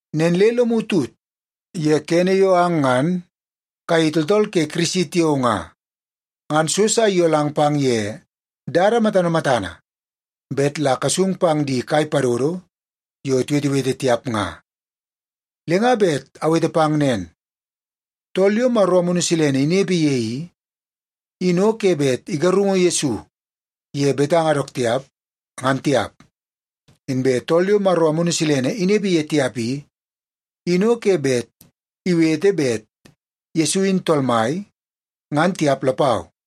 Nen le lomu tut ye kene yo ang ngan kayei tooltool ke Kirisi tiao nga, ngan so sa iyolang pang ye dada matana matana bet la kasung pang di kai padodo yo tiwetewete tiap nga. Le nga bet awete pang nen, tool yo Maro Amunu Silene inepe ye i, in o ke bet igarungu Yesu ye betanga dook tiap, ngan tiap. Inbe tool yo Maro Amunu Silene inepe ye tiap i, in o ke bet iwete bet Yesu in Tool Mai, ngan tiap lapau.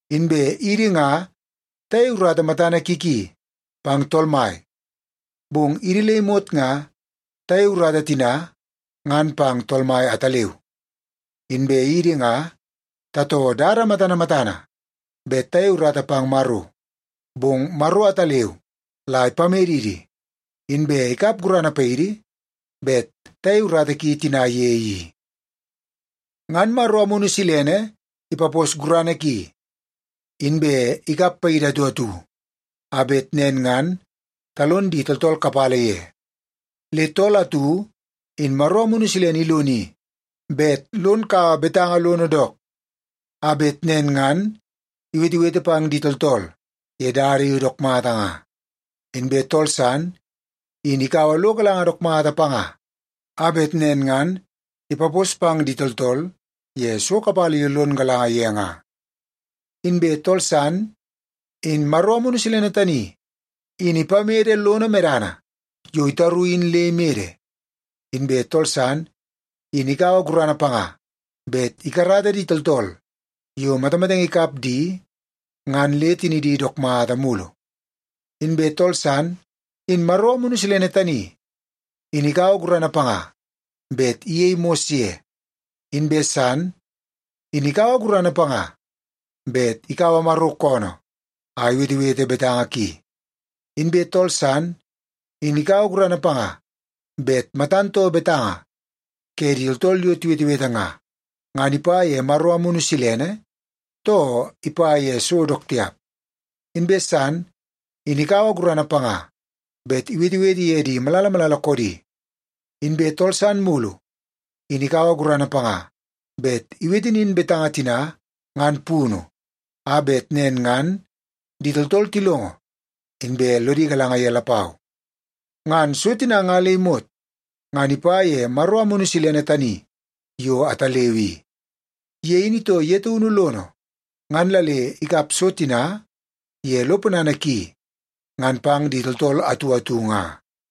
Inbe idi nga tayei urata matana ki ki pang Tool Mai, bong idi le imot nga tayei urata tina ngan pang Tool Mai ataleu. Inbe idi nga tatoo dada matana matana bet tayei urata pang Maro, bong Maro ataleu la ipamedidi, inbe ikap gurana paidi bet tayei urata ki tina ye i. Ngan Maro Amunu Silene ipapos gurana ki, inbe ikap paidi atu atu, a bet nen ngan talon di tooltool kapala ye. Le tool atu in Maro Amunu Silene iloni bet lon kaua betanga lono dook, a bet nen ngan iwetewete pang di tooltool ye dada yo dook mata nga. Inbe tool san in ikaua lo galanga dook mata panga, a bet nen ngan ipapos pang di tooltool ye so kapala yo lon galanga ye nga. Inbe tool san in Maro Amunu Silene tani in ipamede lono medana yo itaru in le imede. Inbe tool san in ikaua gurana panga bet ikarata di tooltool yo matamatenge ikap di ngan le tinidi dook mata mulu. Inbe tool san, in Maro Amunu Silene tani, in ikaua gurana panga bet iyei mos ye. Inbe san, in ikaua gurana panga bet ikaua Maro koonoo a iwetewete betanga ki. Inbe tool san, in ikaua gurana panga bet matan too betanga ke di tooltool yo tiwetewete nga, ngan ipa ye Maro Amunu Silene, too ipa ye so dook tiap. Inbe san, in ikaua gurana panga bet iwetewete ye di malala malala koodi. Inbe tool san mulu, in ikaua gurana panga bet iwete nin betanga tina ngan punu, a bet nen ngan di tooltool tilongo, inbe lodi galanga ye lapau. Ngan so tina nga le imot ngan ipa ye Maro Amunu Silene tani yo ataleu i. Ye in itoo ye taunu lono ngan la le ikap so tina ye lo ponana ki ngan pang di tooltool atu atu nga.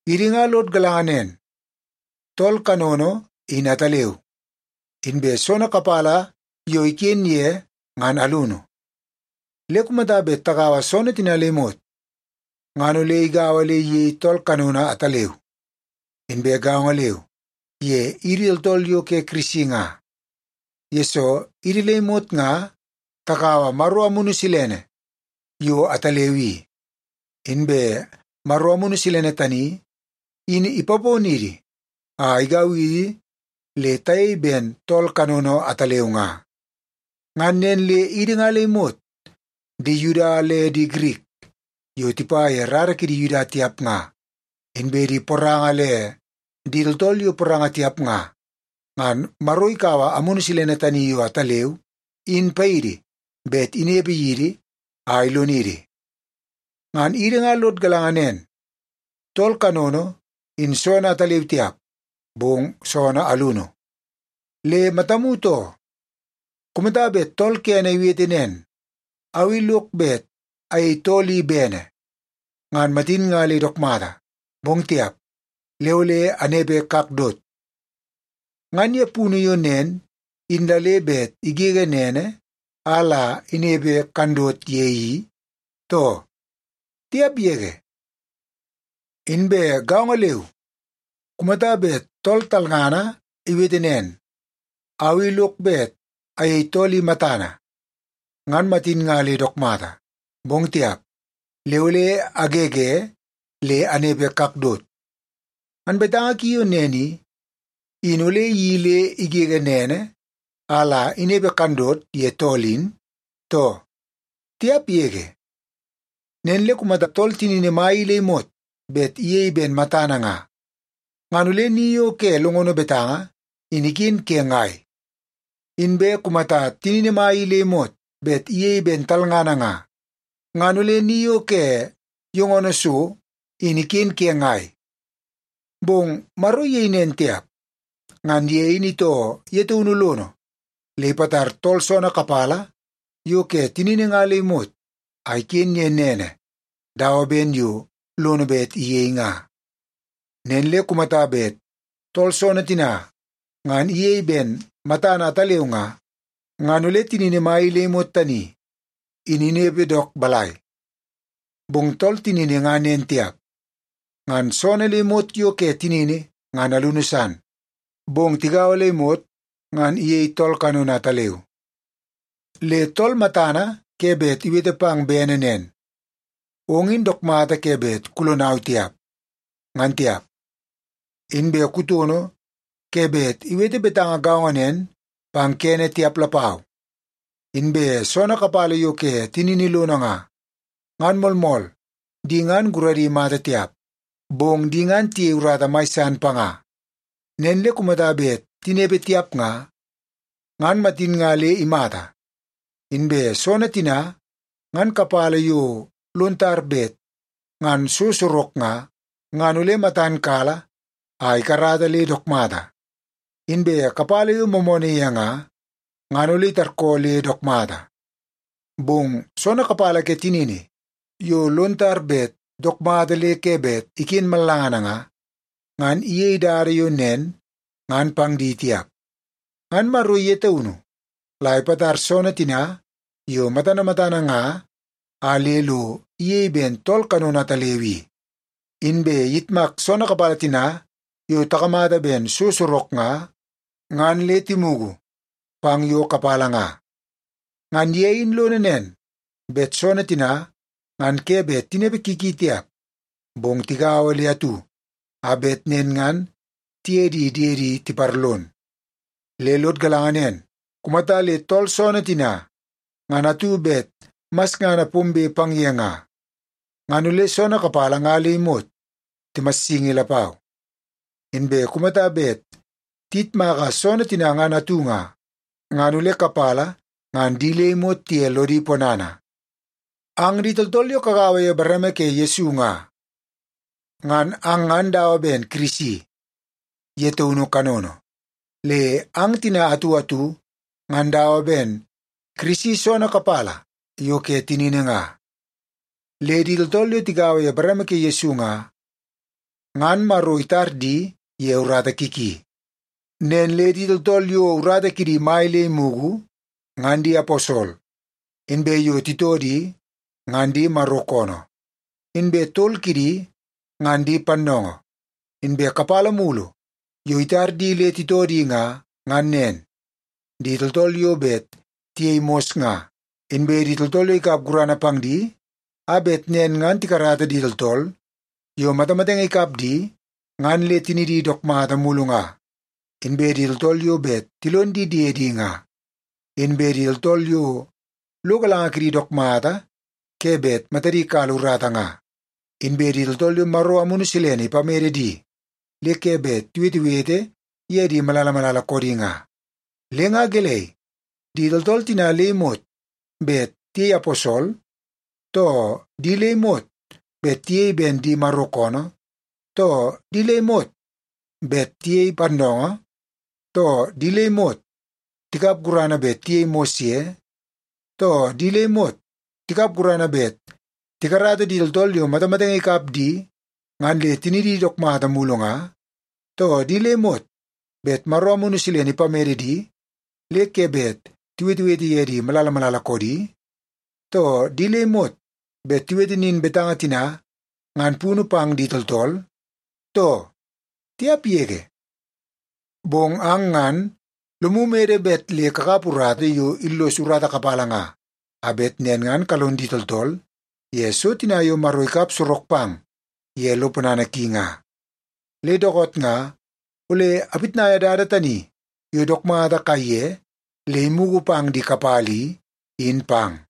Idi nga lod galanga nen, tool kanono in ataleu, inbe soonoo kapala yo iken ye ngan alunu. Le kumata bet tagaua soonoo tina le imot ngan ole igaua le iyei tool kanono ataleu. Inbe gaongo leu ye idi tooltool yo ke Kirisi nga, yesoo idi le imot nga takaua Maro Amunu Silene yo ataleu i. Inbe Maro Amunu Silene tani in ipaponidi a igau idi le tayei ben tool kanono ataleu nga. Ngan nen le idi nga le imot, di Yuda le di Girik yo tipa ye rara ke di Yuda tiap nga, inbe di poranga le di tooltool yo poranga tiap nga, ngan Maro ikaua Amunu Silene tani yo ataleu in paidi bet inepe yidi a ilonidi. Ngan idi nga lod galanga nen, tool kanono in soonoo ataleu tiap, bong soonoo alunu. Le matamu too! Kumata bet tool kene iwete nen, “Au i lok bet ayei tool i bene, ngan matin nga le dook mata. Bong tiap, le ole anepe kakdot,” ngan ye punu yo nen in la le bet igege nene a la inepe kandot ye i, too? Tiap yege! Inbe gaongo leu kumata bet tool talngana iwete nen, “Au i lok bet ayei tool i matana, ngan matin nga le dook mata. Bong tiap, le ole agege le anepe kakdot,” ngan betanga ki yo nen i, in ole iyeii le igege nene a la inepe kandot ye tool in, too? Tiap yege! Nen le kumata tool tinini mai i le imot bet iyei ben matana nga, ngan ole ni yo ke longono betanga in iken ke ngai? Inbe kumata tinini mai i le imot bet iyei ben talngana nga, ngan ole ni yo ke yongono so in iken ke ngai? Bong Maro iyei nen tiap. Ngan ye in itoo ye taunu lono le ipatar tool soonoo kapala yo ke tinini nga le imot a iken ye nene dawa ben yo lono bet iyei nga. Nen le kumata bet tool soonoo tina ngan iyei ben matana ataleu nga, ngan ole tinini mai le imot tani in inepe dook balai? Bong tool tinini nga nen tiap. Ngan soonoo le imot yo ke tinini ngan alunu san, bong tigaua le imot ngan iyei tool kanono ataleu. Le tool matana ke bet iwete pang bene nen, “Ong in dook mata ke bet kulonau tiap,” ngan tiap. Inbe kutono ke bet iwete betanga gaongo nen pang kene tiap lapau. Inbe soonoo kapala yo iken tinini lono nga, ngan moolmool di ngan guradi mata tiap, bong di ngan tiyei urata mai san panga. Nen le kumata bet tinepe tiap nga, ngan matin nga le imata. Inbe soonoo tina ngan kapala yo lon tar bet ngan so sorok nga, ngan ole matan kala a ikarata le dook mata. Inbe kapala yo moomoonoo ye nga, ngan ole itarkoo le dook mata. Bong soonoo kapala ke tinini yo lon tar bet dook mata le ke bet iken mallangana nga, ngan iyei dada yo nen ngan pang di tiap. Ngan Maro ye taunu la ipatar soonoo tina yo matana matana nga a le lo iyei ben tool kanono ataleu i. Inbe iyitmak soonoo kapala tina yo takamata ben so sorok nga, ngan le timugu pang yo kapala nga. Ngan ye in lono nen, bet soonoo tina ngan ke bet tinepe ki ki tiap, bong tigaua le atu a bet nen ngan tiye di diedi tiparlon. Le lod galanga nen, kumata le tool soonoo tina ngan atu bet masngana pombe pang ye nga, ngan ole soonoo kapala nga le imot timassingi lapau. Inbe kumata bet tiyitmaka soonoo tina ngan atu nga, ngan ole kapala ngan di le imot tiye lodi ponana. Ang di tooltool yo kagaua ye bareme ke Yesu nga, ngan ang ngan dawa ben Kirisi ye taunu kanono. Le ang tina atu atu ngan dawa ben Kirisi soonoo kapala yo ke tinini nga. Le di tooltool yo tigaua ye bareme ke Yesu nga, ngan Maro itar di ye urata ki ki. Nen le di tooltool yo urata kidi mai le imugu, ngan di aposol, inbe yo titoo di, ngan di Maro koonoo. Inbe tol kidi ngan di pannoongoo. Inbe kapala mulu yo itar di le titoo di nga, ngan nen: Di tooltool yo bet tiyei mos nga; inbe di tooltool yo ikap gurana pang di a bet nen ngan tikarata di tooltool yo matamatenge ikap di ngan le tinidi dook mulu nga; inbe di tooltool yo bet tilon di diedi nga; inbe di tooltool yo lo galanga kidi dook mata ke bet matadi kala urata nga; inbe di tooltool yo Maro Amunu Silene ipamede di le ke bet tiwetewete ye di malala malala koodi nga. Le nga gelei, di tooltool tina le imot bet tiyei aposol, too di le imot bet tiyei ben di Maro koonoo, too di le imot bet tiyei pannoongoo, too di le imot tikap gurana bet tiyei mos ye, too di le imot tikap gurana bet tikarata di tooltool yo matamatenge ikap di ngan le tinidi dook mata mulu nga, too di le imot bet Maro Amunu Silene ipamede di le ke bet tiwetewete ye di malala malala koodi, too di le imot bet tiwete nin betanga tina ngan punu pang di tooltool, too? Tiap yege! Bong ang ngan lomu mede bet le kakap urata yo illos urata kapala nga, a bet nen ngan kalon di tooltool ye so tina yo Maro ikap sorok pang ye lo ponana ki nga. Le dookoot nga ole apitnaia dada tani yo dook mata kaiye le imugu pang di kapala i, in pang.